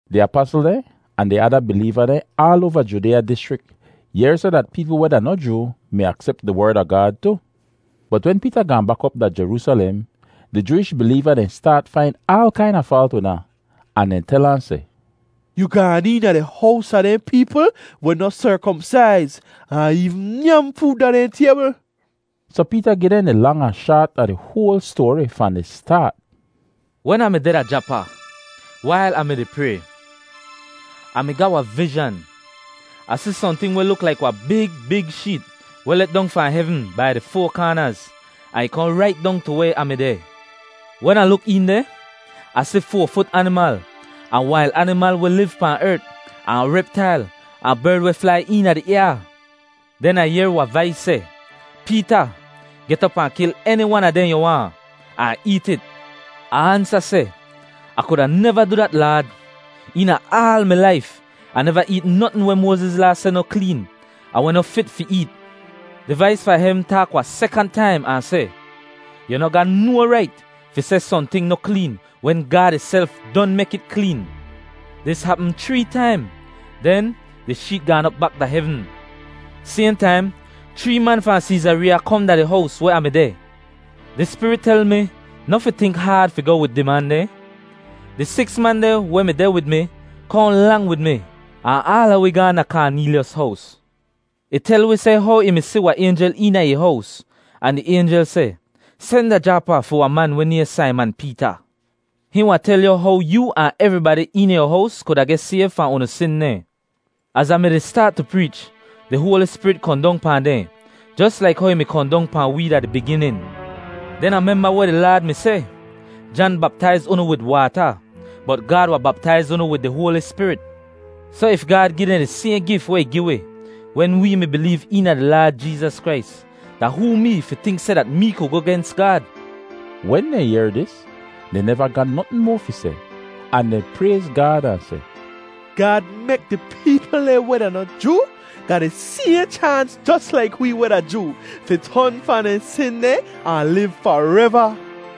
Di apasl dehn ahn di ada bileeva dehn aal oava Judeeya dischrik yehr seh dat peepl weh da noh Joo mi aksep di Werd a Gaad tu. Bot wen Peeta gaahn bak op da Jeroosalem, di Jooish bileeva dehn staat fain aal kaina faalt wid ahn. Ahn dehn tel ahn seh, “Yu gaan eena di hows a dehn peepl weh noh serkomsaiz, ahn eevn nyam food da dehn taybl!” Soh Peeta gi dehn di lang ahn shaat a di hoal stoari fahn di staat, “Wen Ah mi deh da Japa, wail Ah mi-di pray, Ah mi ga wahn vizhan. Ah si sohnting weh luk laik wahn big big sheet weh let dong fahn hevn bai di foa kaanaz, ahn ih kohn rait dong tu weh Ah mi deh. Wen Ah luk een deh, Ah si foa-fut animal ahn wail animal weh liv pahn ert, ahn reptail, ahn berd weh flai eena di ayaa. Den Ah yehr wahn vais seh, ‘Peeta, get op ahn kil eni wan a dehn yu waahn, ahn eet it.’ “Ah ansa seh, ‘Ah kuda neva du dat, Laad! Eena aal mi laif Ah neva eet notn weh Moaziz Laa seh noh kleen ahn weh noh fit fi eet.’ “Di vais fahn hevn taak wahn sekant taim ahn seh, ‘Yu noh ga no rait fi seh sohnting noh kleen wen Gaad ihself don mek it kleen.’ Dis hapm chree taim, den di sheet gaan op bak da hevn. “Sayhn taim chree man fahn Seezareeya kohn da di hows weh Ah mi deh. Di Spirit tel mi noh fi tink haad fi goh wid di man dehn. Di siks man dehn weh mi deh wid mi kohn lang wid mi, ahn aala wi gaahn da Kaaneelyos hows. Ih tel wi seh how ih mi si wahn aynjel eena ih hows, ahn di aynjel seh, ‘Sen da Japa fi wahn man weh nayhn Saiman Peeta. Hihn wahn tel yu how yoo ahn evribadi eena yu hows kuda geh sayv fahn unu sin dehn.’ “Az Ah mi-di staat tu preech, di Hoali Spirit kohn dong pahn dehn, jos laik how ih mi kohn dong pahn wee da di biginin. Den Ah memba weh di Laad mi seh, ‘Jan baptaiz unu wid waata, bot Gaad wahn baptaiz unu wid di Hoali Spirit.’ Soh if Gaad gi dehn di sayhn gif weh ih gi wi wen wee mi bileev eena di Laad Jeezas Krais, da hoo mee fi tink seh dat mee ku goh gens Gaad?” Wen dehn yehr dis, dehn neva ga notn moa fi seh, ahn dehn prayz Gaad ahn seh, “Gaad mek di peepl dehn weh da noh Joo ga di sayhn chaans jos laik wee weh da Joo fi ton fahn dehn sin dehn ahn liv fareva.”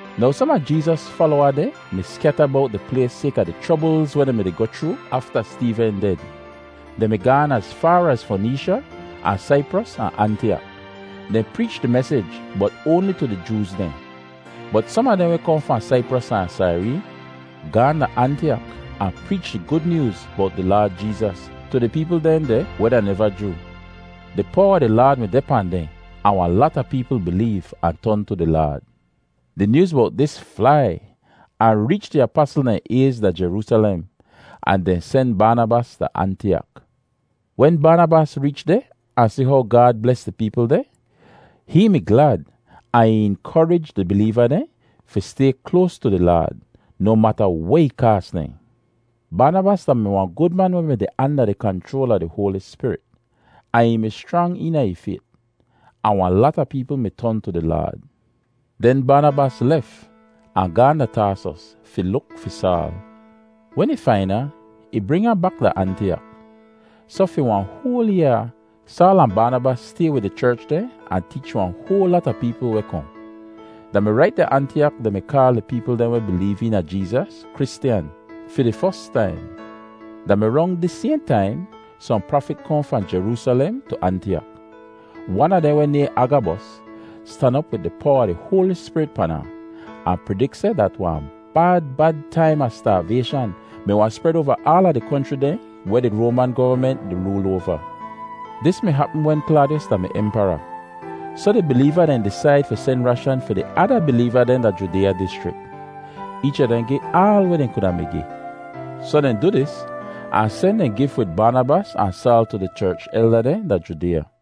Now som a Jeezas falowa dehn mi skyata bowt di plays sayka di chroblz weh dehn mi-di goh chroo afta Steeven ded. Dehn mi gaan az faar az Foneesha ahn Saipros ahn Antiyak; dehn preech di mesij, bot oanli tu di Jooz dehn. Bot som a dehn weh kohn fahn Saipros ahn Saireen gaahn da Antiyak ahn preech di Gud Nyooz bowt di Laad Jeezas tu di peepl dehn deh weh da neva Joo. Di powa a di Laad mi deh pahn dehn ahn wahn lata peepl bileev ahn ton tu di Laad. Di nyooz bowt dis flai ahn reech di apasl dehn ayz da Jeroosalem, ahn dehn sen Baanabas da Antiyak. Wen Baanabas reech deh ahn si how Gaad bles di peepl dehn, hihn mi glad ahn ih inkorij di bileeva dehn fi stay kloas tu di Laad noh mata weh ih kaas dehn! Baanabas da-mi wahn gud man weh mi deh anda di kanchroal a di Hoali Spirit, ahn ih mi schrang eena ih fayt; ahn wahn lata peepl mi ton tu di Laad. Den Baanabas lef ahn gaahn da Taasos fi luk fi Saal. Wen ih fain ahn, ih bring ahn bak da Antiyak. Soh fi wahn hoal yaa Saal ahn Baanabas stay wid di cherch deh ahn teech wahn hoal lata peepl weh kohn. Da mi rait da Antiyak dehn mi kaal di peepl dehn weh bileev eena Jeezas “Kristyan” fi di fos taim. Da mi rong dis sayhn taim, sohn prafit kohn fahn Jeroosalem tu Antiyak. Wan a dehn weh nayhn Agabos stan op wid di powa a di Hoali Spirit pan ahn, ahn pridik seh dat wahn bad bad taim a staavayshan mi wahn spred oava aala di konchri dehn weh di Roaman govament di rool oava. (Dis hapm wen Klaadiyos da-mi di Empara.) Soh di bileeva dehn disaid fi sen rashan fi di ada bileeva dehn da Judeeya dischrik. Eech a dehn gi aal weh dehn kuda mi gi. Soh dehn du dis ahn sen dehn gif wid Baanabas ahn Saal tu di cherch elda dehn da Judeeya.